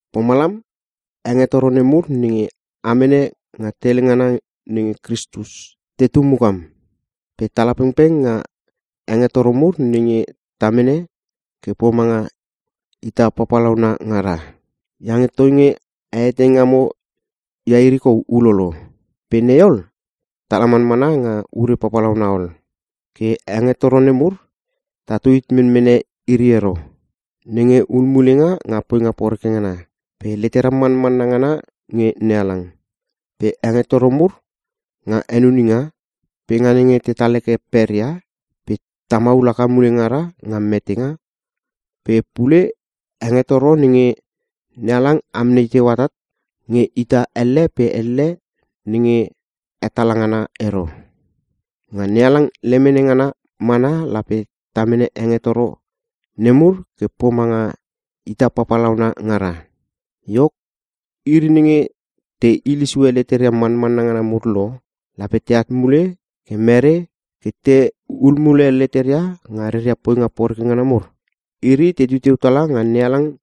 Pomalam, hengetoro nemur nenge a mene nga tele ngana nenge Kristus, tetu mukam. Pe tala pengpeng nga hengetoro mur nenge ta mene ke pomanga ita papalauna ngara. Iange toinge a etei ngamo ia iri kou ulolo. Pe nei ol, tala manmana nga ure papalauna ol. Ke hengetoro nemur tatu hit menmene iri ero; Nenge hulmulenga nga poinga poreke ngana, pe letera manmanna ngana nge NeHalang pe hengetoro mur nga henuninga, pe nga nenge tetal heke peria, pe ta maul haka mule ngara nga metenga, pe pule, hengetoro nenge NeHalang amnei teu atat nge ita elle pe elle nenge hetala ngana ero. Nga NeHalang lemene ngana mana lape ta mene hengetoro nemur ke pomanga ita papalauna ngara. Iok, iri nenge te hile sue leteria manmanna ngana mur lo, lape teat mule ke mere ke tehul mule leteria nga reria poinga poreke ngana mur? Iri tetu teu tala nga NeHalang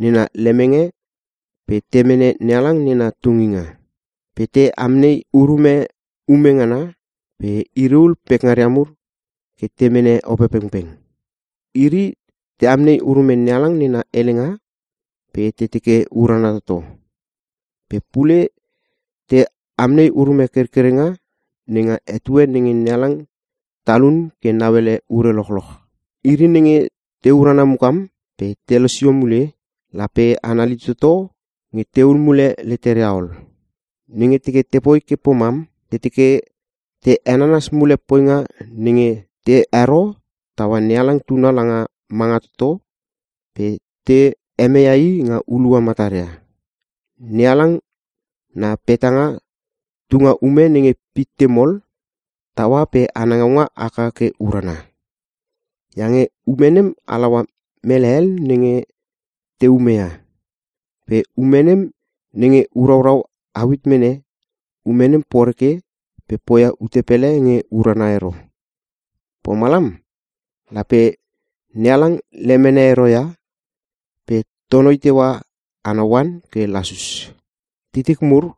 nena lemenge pe te mene NeHalang nena tunginga. Pe te amnei urume ume ngana, pe iri ul pekngaria mur ke te mene Opepengpeng. Iri te amnei urume NeHalang nena helenga pe te teke urana toto. Pe pule te amnei urume kerkerenga nenga etue nenge NeHalang talun ke nauele ure lochoch. Iri nenge te urana mukam pe te losio mule, lape anali toto nge tehul mule leteria ol. Nenge teke te poi ke pomam, te teke te henanas mule poinga nenge te hero taua NeHalang Tuna langa manga toto pe te hemeia i nga hulua mataria. NeHalang na petanga tunga ume nenge pitte mol taua pe ana ngaunga haka ke urana. Iange ume nem halaua mele hel nenge te umeia. Pe ume nenge uraurau au hit mene, ume nem poreke pe poia ute pele nge urana ero. Pomalam, lape NeHalang lemene ero ia pe tonoi teua ana oan ke lasus. Titik mur,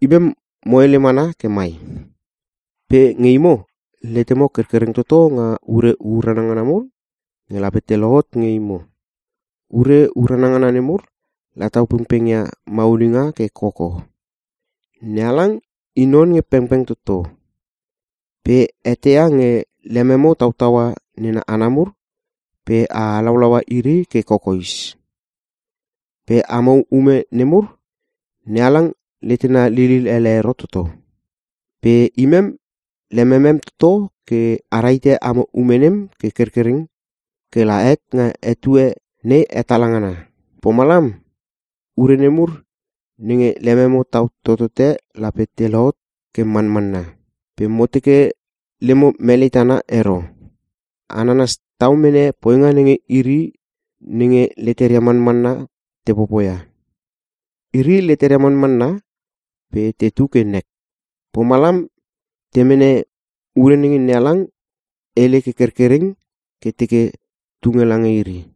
imem mo hele mana ke mai. Pe nge imo, letememo kerkereng toto nga ure urana ngana mur nge lape te lohot nge imo - ure urana ngana nemur la tau pengpeng ia maulinga ke koko. NeHalang i non nge pengpeng toto. Pe eteia nge lememo tautaua nena hana mur pe a halaulaua iri ke kokoes. Pe amo ume nemur, NeHalang letena lilil ele ero toto. Pe imem lememem toto ke a rahite amo ume nem ke kerkereng ke la het nga etue nei hetala ngana. Pomalam, ure nemur nenge lememo tau totote lape te lohot ke manmanna. Pe mo teke lemo melei tana ero. A nanas tau mene poinga nenge iri nenge leteria manmanna te popoia. Iri leteria manmanna pe tetu ke nek. Pomalam te mene ure nenge NeHalang hele ke kerkereng ke teke tunge lange iri.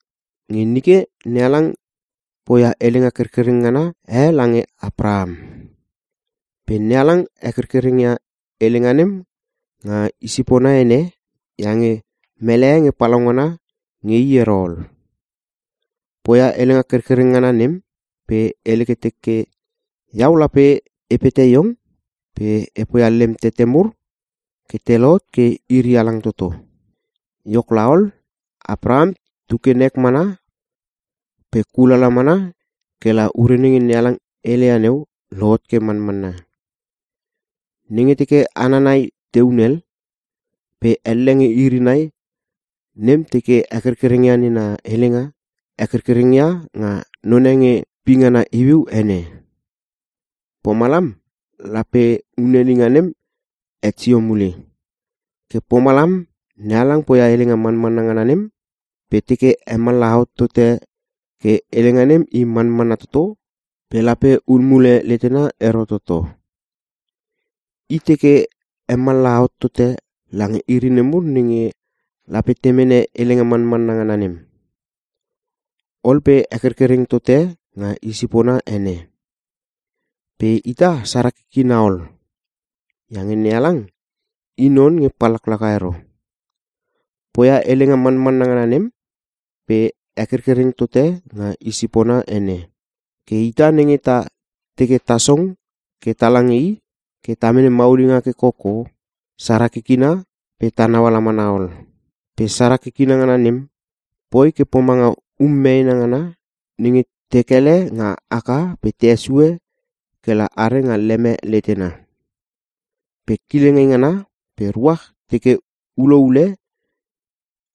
Nge nike NeHalang poia helenga kerkereng ngana e lange Apraham. Pe NeHalang hekerkereng ia helenga nem nga i sipona ene iange mele e nge palaungana nge i ero ol. Poia helenga kerkereng ngana nem, pe hele ke teke, “Iau lape e pete iong pe e poia lem tete mur ke te lohot ke iri halang toto.” Iok laol, Apraham tu ke nek mana pe kulala mana ke la ure nenge NeHalang heleia neu, lohot ke manmanna. Nenge teke hana nai te hunel, pe elle nge iri nai nem teke hekerkereng ia nena helenga, hekerkereng ia nga none nge pingana iuiu ene. Pomalam lape hunelinga nem het sio mule. Ke pomalam, NeHalang poia helenga manmanna ngana nem pe teke hemallaha hot tote ke helenga nem i manmanna toto pe lape hul mule letena ero toto. I teke hemallaha hot tote lange iri nemur nenge lape te mene helenga manmanna ngana nem. Ol pe hekerkereng tote nga i sipona ene. Pe ita, sara kikina ol! Iange NeHalang i non nge pallaklaka ero! Poia helenga manmanna ngana nem pe hekerkereng tote nga i sipona ene. Ke ita nenge ta teke ta song ke tala nge i ke ta mene maulinga ke koko, sara kikina pe ta nauala mana ol. Pe sara kikina ngana nem, poi ke pomanga um meena ngana nenge te kele nga aka pe te hesue ke la are nga leme letena. Pe kileng eingana pe ruach teke ulo ule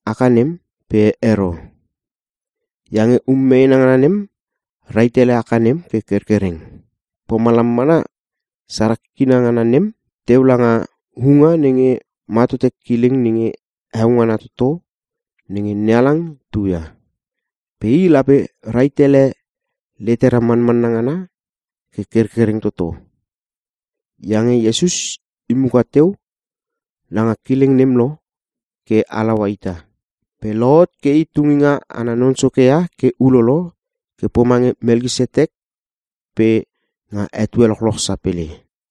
aka nem, pe ero. Iange um meena ngana nem rahit ele aka nem ke kerkereng. Pomalam mana, sara kikina ngana nem teu langa huunga nenge ma tote kileng nenge heo ngana toto nenge NeHalang tu ia. Pe i lape rahit ele letera manmanna ngana ke kerkereng toto. Iange Iesus i muka teu langa kileng nem lo ke halaua ita. Pe lohot ke i Tunginga ana Non Soke ia ke ulolo ke pomange Melkisetek pe nga etue lochoch sapele.